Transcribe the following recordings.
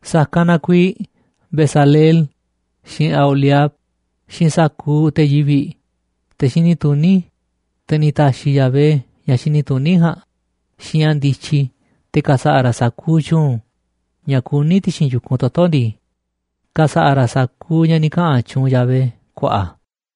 ’Sa̱kanꞌ na kuiiꞌ Bezaleel, xiinꞌ Aholiab, xiinꞌ sa̱kuuꞌ te̱ yivi̱ꞌ, te̱ xini tuní, te̱ ni̱ ta̱xi̱ Yahvé ña̱ xini tuní ja̱a̱nꞌ, xiinꞌ ña̱ ndityi te̱ ka̱sa̱ꞌa̱ ra̱ sa̱kuuꞌ tyu̱u̱n ña̱ kuní ti̱xi̱n yu̱kunꞌ toto̱ ndii, ka̱sa̱ꞌa̱ ra̱ sa̱kuuꞌ ña̱ ni̱ kaꞌa̱n tyuunꞌ Yahvé ku̱a̱ꞌa̱.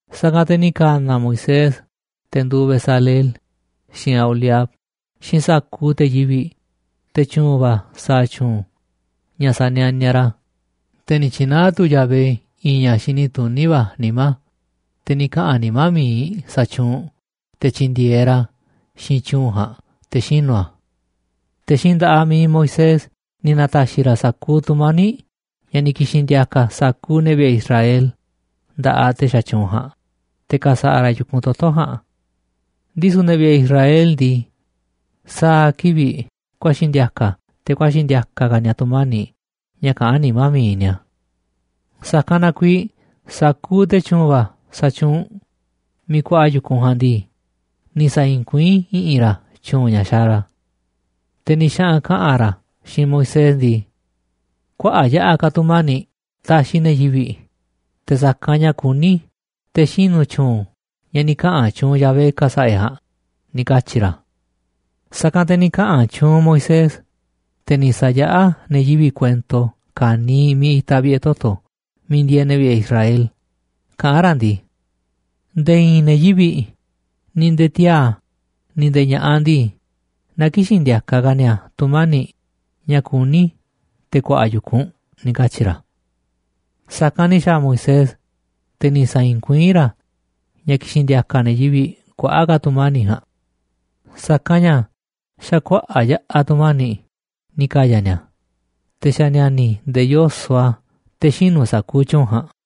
Sa̱kanꞌ te̱ ni̱ ka̱na̱ Moisés te̱ nduuꞌ Bezaleel, xiinꞌ Aholiab, xiinꞌ sa̱kuuꞌ te̱ yivi̱ꞌ, te̱ tyu̱u̱n va̱ sa̱a̱ tyu̱u̱n ña̱ sa̱nianiaꞌ ra̱, te̱ ni̱ tyi̱naá tu̱ Yahvé i̱i̱n ña̱ xini tuní va̱ nimá, te̱ ni̱ kaꞌa̱n nimá mi̱iꞌ sa̱tyuunꞌ te̱ tyi̱ndi̱e̱eꞌ ra̱ xiinꞌ tyu̱u̱n ja̱a̱nꞌ te̱ xinu̱ a̱. Te̱ xiinꞌ nda̱ꞌaꞌ mi̱iꞌ Moisés ni̱ na̱ta̱xi̱ ra̱ sa̱kuuꞌ tu̱mani̱ꞌ ña̱ ni̱ ki̱xi̱n ndi̱a̱ka̱ sa̱kuuꞌ ne̱ vi̱ꞌe̱ Israel nda̱ꞌaꞌ te̱ sa̱tyuunꞌ ja̱a̱nꞌ, te̱ ka̱sa̱ꞌa̱ ra̱ yu̱kunꞌ toto̱ ja̱a̱nꞌ. Ndisu̱ ne̱ vi̱ꞌe̱ Israel ndii, sa̱a̱ kivi̱ꞌ ku̱a̱xi̱ ndi̱a̱ka̱ te̱ ku̱a̱xi̱ ndi̱a̱ka̱ ka̱ ni̱a̱ tu̱mani̱ꞌ ña̱ kaꞌán nimá mi̱iꞌ ni̱a̱. Sa̱kanꞌ na kuiiꞌ sa̱kuuꞌ te̱ tyu̱u̱n va̱ xatyuunꞌ miiꞌ kuaꞌa yu̱kunꞌ ja̱a̱nꞌ ndii, ni̱ sa̱i̱i̱n kuiín i̱ꞌi̱n ra̱ tyu̱u̱n ña̱ xaaꞌ ra̱. Te̱ ni̱ xaꞌa̱n kaꞌa̱n ra̱ xiinꞌ Moisés ndii: ―Kuaꞌa̱ꞌ yaꞌa̱ ka̱ tu̱mani̱ꞌ taxiꞌ ne̱ yivi̱ꞌ te̱ sa̱kanꞌ ña̱ kuní te̱ xinu̱ tyu̱u̱n ña̱ ni̱ kaꞌa̱n tyuunꞌ Yahvé ka̱sa̱ꞌa̱ e̱ꞌ ja̱a̱nꞌ ―ni̱ katyi̱ ra̱. Sa̱kanꞌ te̱ ni̱ kaꞌa̱n tyuunꞌ Moisés, te̱ ni̱ sa̱yaꞌá ne̱ yivi̱ꞌ kuento ka̱niiꞌ miiꞌ itaꞌ vi̱ꞌe̱ toto̱ miiꞌ ndieeꞌ ne̱ vi̱ꞌe̱ Israel, kaꞌán ra̱ ndii: ―Nde̱e̱ i̱i̱n ne̱ yivi̱ꞌ, ni̱ nde̱e̱ tiaa̱, ni̱ nde̱e̱ ña̱ꞌaꞌ ndii, na kï̱xi̱n ndi̱a̱ka̱ ka̱ ni̱a̱ tu̱mani̱ꞌ ña̱ kuní te̱ ku̱a̱ꞌa̱ yu̱kunꞌ ―ni̱ katyi̱ ra̱. Sa̱kanꞌ ni̱ xa̱a̱ Moisés, te̱ ni̱ sa̱i̱i̱n kuiín ra̱ ña̱ ki̱xi̱n ndi̱a̱ka̱ ne̱ yivi̱ꞌ kuaꞌa̱ꞌ ka̱ tu̱mani̱ꞌ ja̱a̱nꞌ. Sa̱kanꞌ ña̱ xa̱ kuaꞌa̱ꞌ yaꞌa̱ tu̱mani̱ꞌ ni̱ ka̱ya̱ ni̱a̱, te̱ xa̱ ni̱a̱ni̱ nde̱e̱ yoso̱ꞌ a̱ te̱ xinu̱ sa̱kuuꞌ tyu̱u̱n ja̱a̱nꞌ.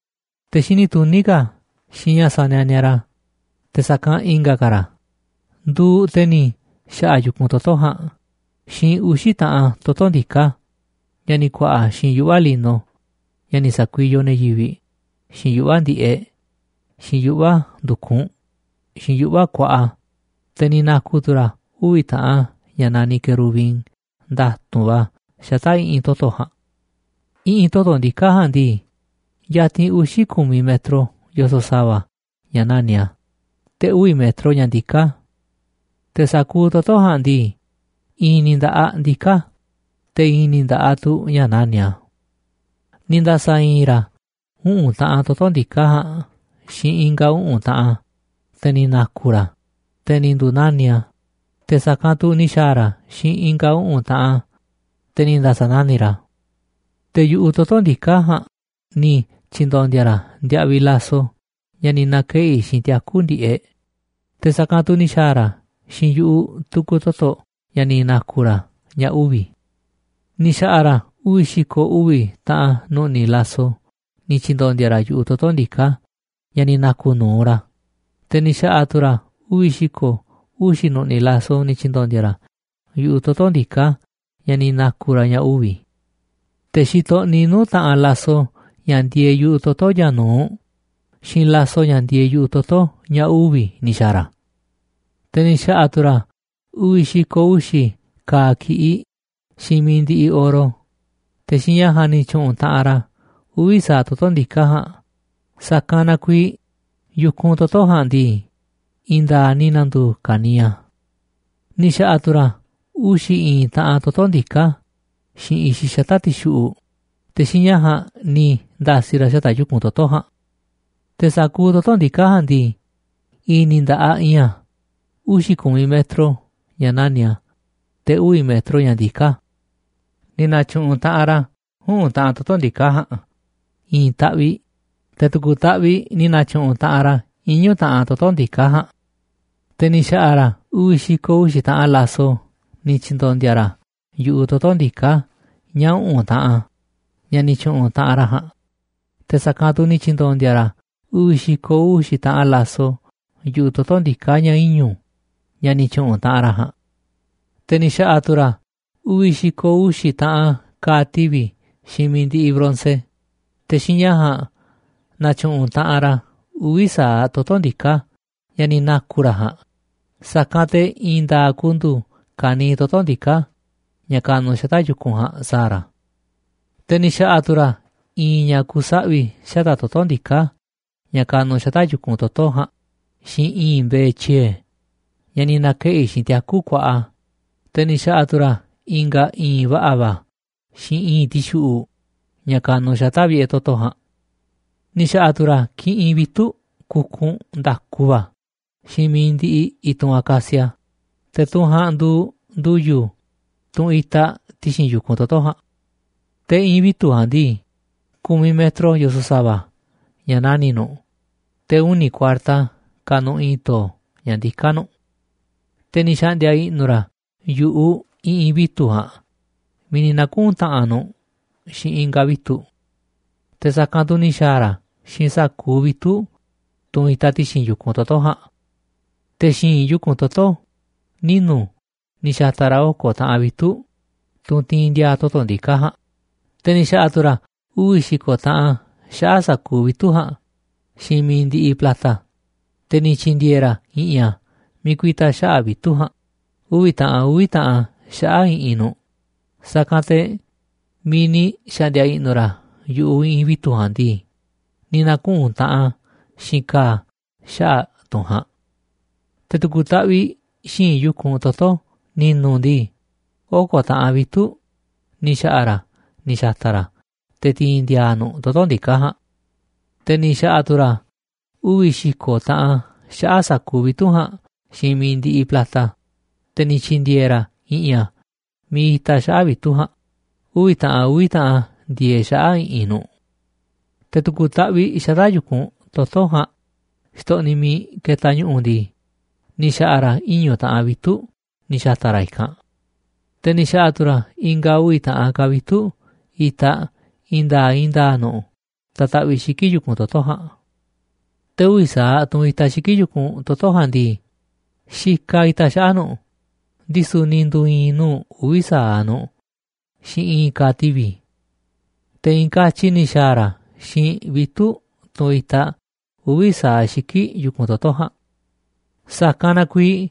Te̱ xini tuní ka̱ xiinꞌ ña̱ sanianiaꞌ ra̱ te̱ sa̱kanꞌ i̱nga̱ ka̱ ra̱ nduuꞌ te̱ ni̱ xa̱ꞌa̱ yu̱kunꞌ toto̱ ja̱a̱nꞌ xiinꞌ uxi̱ taꞌan toto̱ ndiká, ña̱ ni̱ ku̱a̱ꞌa̱ xiinꞌ yuꞌva̱ lino ña̱ ni̱ sa̱kuiyoꞌ ne̱ yivi̱ꞌ xiinꞌ yuꞌva̱ ndi̱ꞌeꞌ, xiinꞌ yuꞌva̱ ndu̱kunꞌ, xiinꞌ yuꞌva̱ kuaꞌa, te̱ ni̱ na̱ku̱ tu̱ ra̱ uvi̱ taꞌan ña̱ naniꞌ querubin nda̱tu̱nꞌ va̱ xata̱ꞌ i̱ꞌi̱n toto̱ ja̱a̱nꞌ. I̱ꞌi̱n toto̱ ndiká ja̱a̱nꞌ ndii, yatinꞌ uxi̱ ku̱miꞌ metro yoso̱ꞌ sa̱va̱ ña̱ nani̱ꞌ a̱, te̱ uvi̱ metro ña̱ ndiká a̱. Te̱ sa̱kuuꞌ toto̱ ja̱a̱nꞌ ndii, i̱i̱n ni̱ nda̱ꞌaꞌ ndiká a̱, te̱ i̱i̱n ni̱ nda̱ꞌaꞌ tu̱ ña̱ nani̱ꞌ a̱. Ni̱ nda̱sa̱i̱i̱n ra̱ uꞌu̱n taꞌan toto̱ ndiká ja̱a̱nꞌ xiinꞌ i̱nga̱ uꞌu̱n taꞌan a̱, te̱ ni̱ na̱ku̱ ra̱ a̱, te̱ ni̱ ndu̱nani̱ꞌ a̱, te̱ sa̱kanꞌ tu̱ ni̱ xa̱a̱ ra̱ xiinꞌ i̱nga̱ uꞌu̱n taꞌan a̱, te̱ ni̱ nda̱sa̱nani̱ꞌ ra̱ a̱. Te̱ yu̱ꞌuꞌ toto̱ ndiká ja̱a̱nꞌ ni̱ tyi̱ndo̱ndi̱a̱ ra̱ ndiaꞌviꞌ laso ña̱ ni̱ na̱keꞌi̱ xiinꞌ tiaku̱ ndi̱ꞌeꞌ, te̱ sa̱kanꞌ tu̱ ni̱ xa̱a̱ ra̱ xiinꞌ yu̱ꞌuꞌ tu̱ku̱ toto̱ ña̱ ni̱ na̱ku̱ ra̱ ña̱ uvi̱. Ni̱ xa̱ꞌa̱ ra̱ uvi̱ xi̱ko̱ uvi̱ taꞌan nu̱ꞌni̱ laso ni̱ tyi̱ndo̱ndi̱a̱ ra̱ yu̱ꞌuꞌ toto̱ ndiká ña̱ ni̱ na̱ku̱ nu̱uꞌ ra̱, te̱ ni̱ xa̱ꞌa̱ tu̱ ra̱ uvi̱ xi̱ko̱ uxi̱ nu̱ꞌni̱ laso ni̱ tyi̱ndo̱ndi̱a̱ ra̱ yu̱ꞌuꞌ toto̱ ndiká ña̱ ni̱ na̱ku̱ ra̱ ña̱ uvi̱. Te̱ xitoꞌniꞌ nuu̱ꞌ taꞌanꞌ laso ña̱ ndieeꞌ yu̱ꞌuꞌ toto̱ ña̱ nu̱uꞌ xiinꞌ laso ña̱ ndieeꞌ yu̱ꞌuꞌ toto̱ ña̱ uvi̱ ni̱ xa̱a̱ ra̱. Te̱ ni̱ xa̱ꞌa̱ tu̱ ra̱ uvi̱ xi̱ko̱ uxi̱ ka̱a̱ ki̱ꞌiꞌ xiinꞌ mi̱iꞌ ndiꞌiꞌ oro, te̱ xiinꞌ ña̱ ja̱a̱nꞌ ni̱ tyu̱ꞌu̱n taꞌanꞌ ra̱ uvi̱ sa̱aꞌ toto̱ ndiká ja̱a̱nꞌ, sa̱kanꞌ na kuiiꞌ yu̱kunꞌ toto̱ ja̱a̱nꞌ ndii, i̱i̱n nda̱a̱ꞌ ni̱ na̱ndu̱u̱ ka̱niiꞌ a̱. Ni̱ xa̱ꞌa̱ tu̱ ra̱ uxi̱ i̱i̱n taꞌan toto̱ ndiká xiinꞌ i̱xiꞌ xata̱ꞌ ti̱xuꞌu̱ꞌ, te̱ xiinꞌ ña̱ ja̱a̱nꞌ ni̱ nda̱si̱ ra̱ xata̱ꞌ yu̱kunꞌ toto̱ ja̱a̱nꞌ. Te̱ sa̱kuuꞌ toto̱ ndiká ja̱a̱nꞌ ndii, i̱i̱n ni̱ nda̱ꞌaꞌ iinꞌ a̱, uxi̱ ku̱miꞌ metro ña̱ nani̱ꞌ a̱, te̱ uvi̱ metro ña̱ ndiká a̱. Ni̱ na̱tyu̱ꞌu̱n taꞌanꞌ ra̱ uꞌu̱n taꞌan toto̱ ndiká ja̱a̱nꞌ i̱i̱n taꞌviꞌ, te̱ tu̱ku̱ taꞌviꞌ ni̱ na̱tyu̱ꞌu̱n taꞌanꞌ ra̱ iñu̱ taꞌan toto̱ ndiká ja̱a̱nꞌ. Te̱ ni̱ xa̱ꞌa̱ ra̱ uvi̱ xi̱ko̱ uxi̱ taꞌan laso ni̱ tyi̱ndo̱ndi̱a̱ ra̱ yu̱ꞌuꞌ toto̱ ndiká ña̱ uꞌu̱n taꞌa, ña̱ ni̱ tyu̱ꞌu̱n taꞌanꞌ ra̱ ja̱a̱nꞌ, te̱ sa̱kanꞌ tu̱ ni̱ tyi̱ndo̱ndi̱a̱ ra̱ uvi̱ xi̱ko̱ uxi̱ taꞌan laso yu̱ꞌuꞌ toto̱ ndiká ña̱ iñu̱ ña̱ ni̱ tyu̱ꞌu̱n taꞌanꞌ ra̱ ja̱a̱nꞌ. Te̱ ni̱ xa̱ꞌa̱ tu̱ ra̱ uvi̱ xi̱ko̱ uxi̱ taꞌan ka̱a̱ tivi̱ xiinꞌ mi̱iꞌ ndiꞌiꞌ bronce, te̱ xiinꞌ ña̱ ja̱a̱nꞌ na̱tyu̱ꞌu̱n taꞌanꞌ ra̱ uvi̱ sa̱aꞌ toto̱ ndiká ña̱ ni̱ naku̱ ra̱ ja̱a̱nꞌ, sa̱kan te̱ i̱i̱n nda̱a̱ꞌ ku̱ndu̱u̱ ka̱niiꞌ toto̱ ndiká ña̱ kanuꞌ xata̱ꞌ yu̱kunꞌ ja̱a̱nꞌ sa̱a̱ ra̱. Te̱ ni̱ xa̱ꞌa̱ tu̱ ra̱ i̱i̱nꞌ ña̱ ku̱saꞌvi̱ xata̱ꞌ toto̱ ndiká ña̱ kanuꞌ xata̱ꞌ yu̱kunꞌ toto̱ ja̱a̱nꞌ xiinꞌ i̱i̱nꞌ mbe̱e̱ tyiee̱ ña̱ ni̱ na̱keꞌi̱ xiinꞌ tiaku kuaꞌa, te̱ ni̱ xa̱ꞌa̱ tu̱ ra̱ i̱nga̱ i̱i̱nꞌ va̱ꞌa̱ va̱ xiinꞌ i̱i̱nꞌ ti̱xuꞌu̱ꞌ ña̱ ka̱nuꞌ xata̱ꞌ vi̱ꞌe̱ toto̱ ja̱a̱nꞌ. Ni̱ xa̱ꞌa̱ tu̱ ra̱ kiꞌinꞌ vitu̱ꞌ kukunꞌ nda̱ku va̱ xiinꞌ mi̱iꞌ ndiꞌiꞌ i̱tunꞌ acacia, te̱ tunꞌ ja̱a̱nꞌ nduuꞌ ndu̱yu̱, tunꞌ itaꞌ ti̱xi̱n yu̱kunꞌ toto̱ ja̱a̱nꞌ. Te̱ i̱ꞌi̱n vitu̱ꞌ ja̱a̱nꞌ ndii, ku̱miꞌ metro yoso̱ꞌ sa̱va̱ ña̱ nani̱ꞌ nu̱ꞌ, te̱ uni̱ kuarta kanuꞌ i̱i̱n to̱o̱ ña̱ ndiká nu̱ꞌ. Te̱ ni̱ xa̱ꞌndi̱a̱ i̱ꞌnu̱ ra̱ yu̱ꞌuꞌ i̱ꞌi̱n vitu̱ꞌ ja̱a̱nꞌ miiꞌ ni̱ na̱kuꞌu̱n taꞌanꞌ nu̱ꞌ xiinꞌ i̱nga̱ vitu̱ꞌ. Te̱ sa̱kanꞌ tu̱ ni̱ xa̱a̱ ra̱ xiinꞌ sa̱kuuꞌ vitu̱ꞌ, tunꞌ itaꞌ ti̱xi̱n yu̱kunꞌ toto̱ ja̱a̱nꞌ. Te̱ xi̱i̱nꞌ yu̱kunꞌ toto̱ ninu̱ ni̱ xa̱ta̱ ra̱ oko̱ taꞌan vitu̱ꞌ, tunꞌ tiinꞌ ndi̱a̱a̱ toto̱ ndiká ja̱a̱nꞌ, te̱ ni̱ xa̱ꞌa̱ tu̱ ra̱ uvi̱ xi̱ko̱ taꞌan xaꞌa̱ꞌ sa̱kuuꞌ vitu̱ꞌ ja̱a̱nꞌ xiinꞌ mi̱iꞌ ndiꞌiꞌ plata, te̱ ni̱ tyi̱ndi̱e̱e̱ ra̱ i̱ꞌi̱n a̱ miiꞌ ku̱i̱ta̱ xaꞌa̱ꞌ vitu̱ꞌ ja̱a̱nꞌ, uvi̱ taꞌan a̱ uvi̱ taꞌan a̱ xaꞌa̱ꞌ i̱ꞌi̱n nu̱ꞌ, sa̱kanꞌ te̱ miiꞌ ni̱ xa̱ꞌndi̱a̱ i̱ꞌnu̱ ra̱ yu̱ꞌuꞌ i̱ꞌi̱n vitu̱ꞌ ja̱a̱nꞌ ndii, ni̱ na̱kuꞌu̱n taꞌanꞌ a̱ xiinꞌ ka̱a̱ xaꞌa̱ꞌ tunꞌ ja̱a̱nꞌ. Te̱ tu̱ku̱ taꞌviꞌ xi̱i̱nꞌ yu̱kunꞌ toto̱ ni̱nu̱ ndii, oko̱ taꞌan vitu̱ꞌ ni̱ xa̱ꞌa̱ ra̱ ni̱ xa̱ta̱ ra̱ te̱ ti̱i̱n ndi̱a̱a̱ nu̱ꞌ toto̱ ndiká ja̱a̱nꞌ. Te̱ ni̱ xa̱ꞌa̱ tu̱ ra̱ uvi̱ xi̱ko̱ taꞌan xaꞌa̱ꞌ sa̱kuuꞌ vitu̱ꞌ ja̱a̱nꞌ xiinꞌ mi̱iꞌ ndiꞌiꞌ plata, te̱ ni̱ tyi̱ndi̱e̱e̱ ra̱ i̱ꞌi̱n a̱ miiꞌ itaꞌ xaꞌa̱ꞌ vitu̱ꞌ ja̱a̱nꞌ, uvi̱ taꞌan a̱ uvi̱ taꞌan a̱ ndieeꞌ xaꞌa̱ꞌ i̱ꞌi̱n nu̱ꞌ. Te̱ tu̱ku̱ taꞌviꞌ xata̱ꞌ yu̱kunꞌ toto̱ ja̱a̱nꞌ xtoꞌniꞌ miiꞌ ketaꞌ ñu̱ꞌu̱ ndii, ni̱ xa̱ꞌa̱ ra̱ iñu̱ taꞌan vitu̱ꞌ ni̱ xa̱ta̱ ra̱ i̱kanꞌ. Te̱ ni̱ xa̱ꞌa̱ tu̱ ra̱ i̱nga̱ uvi̱ taꞌan ka̱ vitu̱ꞌ itaꞌ i̱i̱n nda̱a̱ꞌ i̱i̱n nda̱a̱ꞌ nu̱ꞌ ta̱taꞌviꞌ xiki̱ꞌ yu̱kunꞌ toto̱ ja̱a̱nꞌ. Te̱ uvi̱ sa̱aꞌ tunꞌ itaꞌ xiki̱ꞌ yu̱kunꞌ toto̱ ja̱a̱nꞌ ndii, xikaꞌ itaꞌ xaꞌa̱ꞌ nu̱ꞌ, ndisu̱ ni̱ ndu̱u̱ i̱i̱n nuu̱ꞌ uvi̱ sa̱aꞌ nu̱ꞌ xiinꞌ i̱i̱n ka̱a̱ tivi̱. Te̱ i̱i̱n katyi ni̱ xa̱a̱ ra̱ xiinꞌ vitu̱ꞌ, tunꞌ itaꞌ uvi̱ sa̱aꞌ xiki̱ꞌ yu̱kunꞌ toto̱ ja̱a̱nꞌ. Sa̱kanꞌ na kuiiꞌ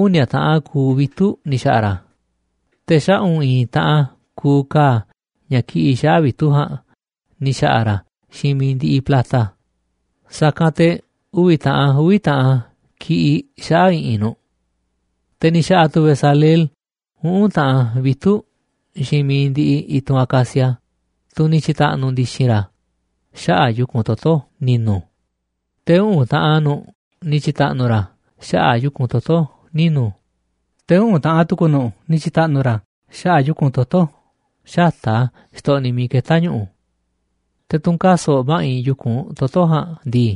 uni̱a̱ taꞌan kuuꞌ vitu̱ꞌ ni̱ xa̱ꞌa̱ ra̱, te̱ xaꞌu̱n i̱i̱n taꞌan kuuꞌ ka̱a̱ ña̱ kiꞌiꞌ xaꞌa̱ꞌ vitu̱ꞌ ja̱a̱nꞌ ni̱ xa̱ꞌa̱ ra̱ xiinꞌ mi̱iꞌ ndiꞌiꞌ plata, sa̱kanꞌ te̱ uvi̱ taꞌan a̱ uvi̱ taꞌan a̱ kiꞌiꞌ xaꞌa̱ꞌ i̱ꞌi̱n nu̱ꞌ. Te̱ ni̱ xa̱ꞌa̱ tu̱ Bezaleel uꞌu̱n taꞌan vitu̱ꞌ xiinꞌ miiꞌ ndiꞌiꞌ i̱tunꞌ acacia, tunꞌ ni̱ tyi̱ta̱ꞌnu̱ ndi̱xi̱n ra̱ xaꞌa̱ꞌ yu̱kunꞌ toto̱ ni̱nu̱, te̱ uꞌu̱n taꞌan nu̱ꞌ ni̱ tyi̱ta̱ꞌnu̱ ra̱ xaꞌa̱ꞌ yu̱kunꞌ toto̱ ninu̱, te̱ uꞌu̱n taꞌan tu̱ku̱ nu̱ꞌ ni̱ tyi̱ta̱ꞌnu̱ ra̱ xaꞌa̱ꞌ yu̱kunꞌ toto̱ xata̱ꞌ a̱ xtoꞌniꞌ miiꞌ ketá ñu̱ꞌu̱. Te̱ tunꞌ kaso̱ꞌ ma̱ꞌiꞌ yu̱kunꞌ toto̱ ja̱a̱nꞌ ndii,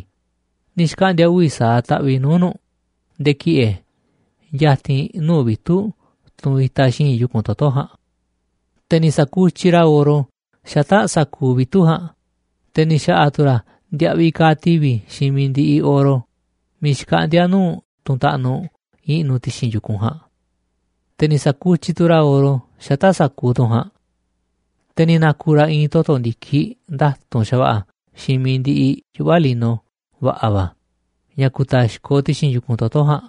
ni̱ xkaꞌndi̱a̱ uvi̱ sa̱aꞌ taꞌviꞌ nuu̱ꞌ nu̱ꞌ nde̱e̱ ki̱ꞌe̱ ya̱ti̱n nuu̱ꞌ vitu̱ꞌ tunꞌ itaꞌ xi̱i̱nꞌ yu̱kunꞌ toto̱ ja̱a̱nꞌ. Te̱ ni̱ sa̱kutyiꞌ ra̱ oro xata̱ꞌ sa̱kuuꞌ vitu̱ꞌ ja̱a̱nꞌ, te̱ ni̱ xa̱ꞌa̱ tu̱ ra̱ ndiaꞌviꞌ ka̱a̱ tivi̱ xiinꞌ mi̱iꞌ ndiꞌiꞌ oro, miiꞌ xkaꞌndíá nuu̱ꞌ tunꞌ taꞌnuꞌ i̱ꞌnu̱ ti̱xi̱n yu̱kunꞌ ja̱a̱nꞌ. Te̱ ni̱ sa̱kutyiꞌ tu̱ ra̱ oro xata̱ꞌ sa̱kuuꞌ tunꞌ ja̱a̱nꞌ. Te̱ ni̱ na̱ku̱ ra̱ i̱i̱n toto̱ ndi̱kiꞌ nda̱tu̱nꞌ xa̱va̱ꞌa̱ xiinꞌ mi̱iꞌ ndiꞌiꞌ yuꞌva̱ lino va̱ꞌa̱ va̱ ña̱ ku̱ta̱xkoꞌ ti̱xi̱n yu̱kunꞌ toto̱ ja̱a̱nꞌ.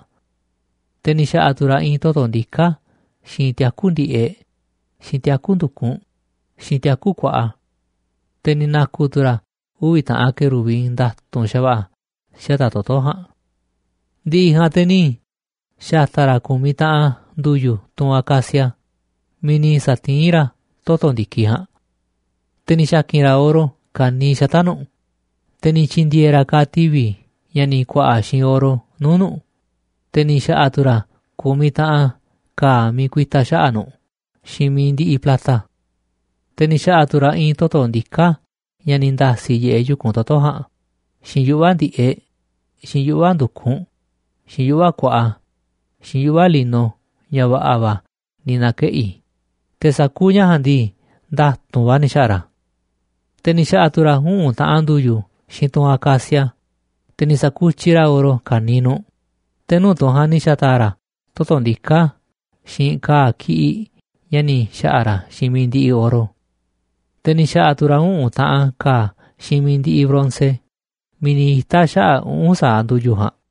Te̱ ni̱ xa̱ꞌa̱ tu̱ ra̱ i̱i̱n toto̱ ndiká xiinꞌ tiaku̱ ndi̱ꞌeꞌ, xiinꞌ tiaku̱ ndu̱kunꞌ, xiinꞌ tiaku̱ kuaꞌa. Te̱ ni̱ na̱ku̱ tu̱ ra̱ uvi̱ taꞌan querubin nda̱tu̱nꞌ xa̱va̱ꞌa̱ xata̱ꞌ toto̱ ja̱a̱nꞌ. Ndiꞌiꞌ ja̱a̱nꞌ te̱ ni̱ xa̱ta̱ ra̱ ku̱miꞌ taꞌan ndu̱yu̱, tunꞌ acacia, miiꞌ ni̱ sa̱tiín ra̱ toto̱ ndi̱kiꞌ ja̱a̱nꞌ. Te̱ ni̱ xa̱ki̱n ra̱ oro ka̱niiꞌ xata̱ꞌ nu̱ꞌ, te̱ ni̱ tyi̱ndi̱e̱e̱ ra̱ ka̱a̱ tivi̱ ña̱ ni̱ ku̱a̱ꞌa̱ xiinꞌ oro nuu̱ꞌ nu̱ꞌ, te̱ ni̱ xa̱ꞌa̱ tu̱ ra̱ ku̱miꞌ taꞌan ka̱a̱ miiꞌ ku̱i̱ta̱ xaꞌa̱ꞌ nu̱ꞌ xiinꞌ mi̱iꞌ ndiꞌiꞌ plata. Te̱ ni̱ xa̱ꞌa̱ tu̱ ra̱ i̱i̱n toto̱ ndiká ña̱ ni̱ nda̱si̱ yiꞌeꞌ yu̱kunꞌ toto̱ ja̱a̱nꞌ, xiinꞌ yuꞌva̱ ndi̱ꞌeꞌ, xiinꞌ yuꞌva̱ ndu̱kunꞌ, xiinꞌ yuꞌva̱ kuaꞌa, xiinꞌ yuꞌva̱ lino ña̱ va̱ꞌa̱ va̱ ni̱ na̱keꞌi̱, te̱ sa̱kuuꞌ ña̱ ja̱a̱nꞌ ndii, nda̱tu̱nꞌ va̱ ni̱ xa̱ꞌa̱ ra̱ a̱. Te̱ ni̱ xa̱ꞌa̱ tu̱ ra̱ uꞌu̱n taꞌan ndu̱yu̱ xiinꞌ tunꞌ acacia, te̱ ni̱ sa̱kutyiꞌ ra̱ oro ka̱niiꞌ nu̱ꞌ, te̱ nuu̱ꞌ tunꞌ ja̱a̱nꞌ ni̱ xa̱ta̱a̱ ra̱ toto̱ ndiká xiinꞌ ka̱a̱ ki̱ꞌiꞌ ña̱ ni̱ xa̱ꞌa̱ ra̱ xiinꞌ mi̱iꞌ ndiꞌiꞌ oro. Te̱ ni̱ xa̱ꞌa̱ tu̱ ra̱ uꞌu̱n taꞌan ka̱a̱ xiinꞌ mi̱iꞌ ndiꞌiꞌ bronce miiꞌ ni̱ ita̱ xaꞌa̱ꞌ uꞌu̱n sa̱aꞌ ndu̱yu̱ ja̱a̱nꞌ.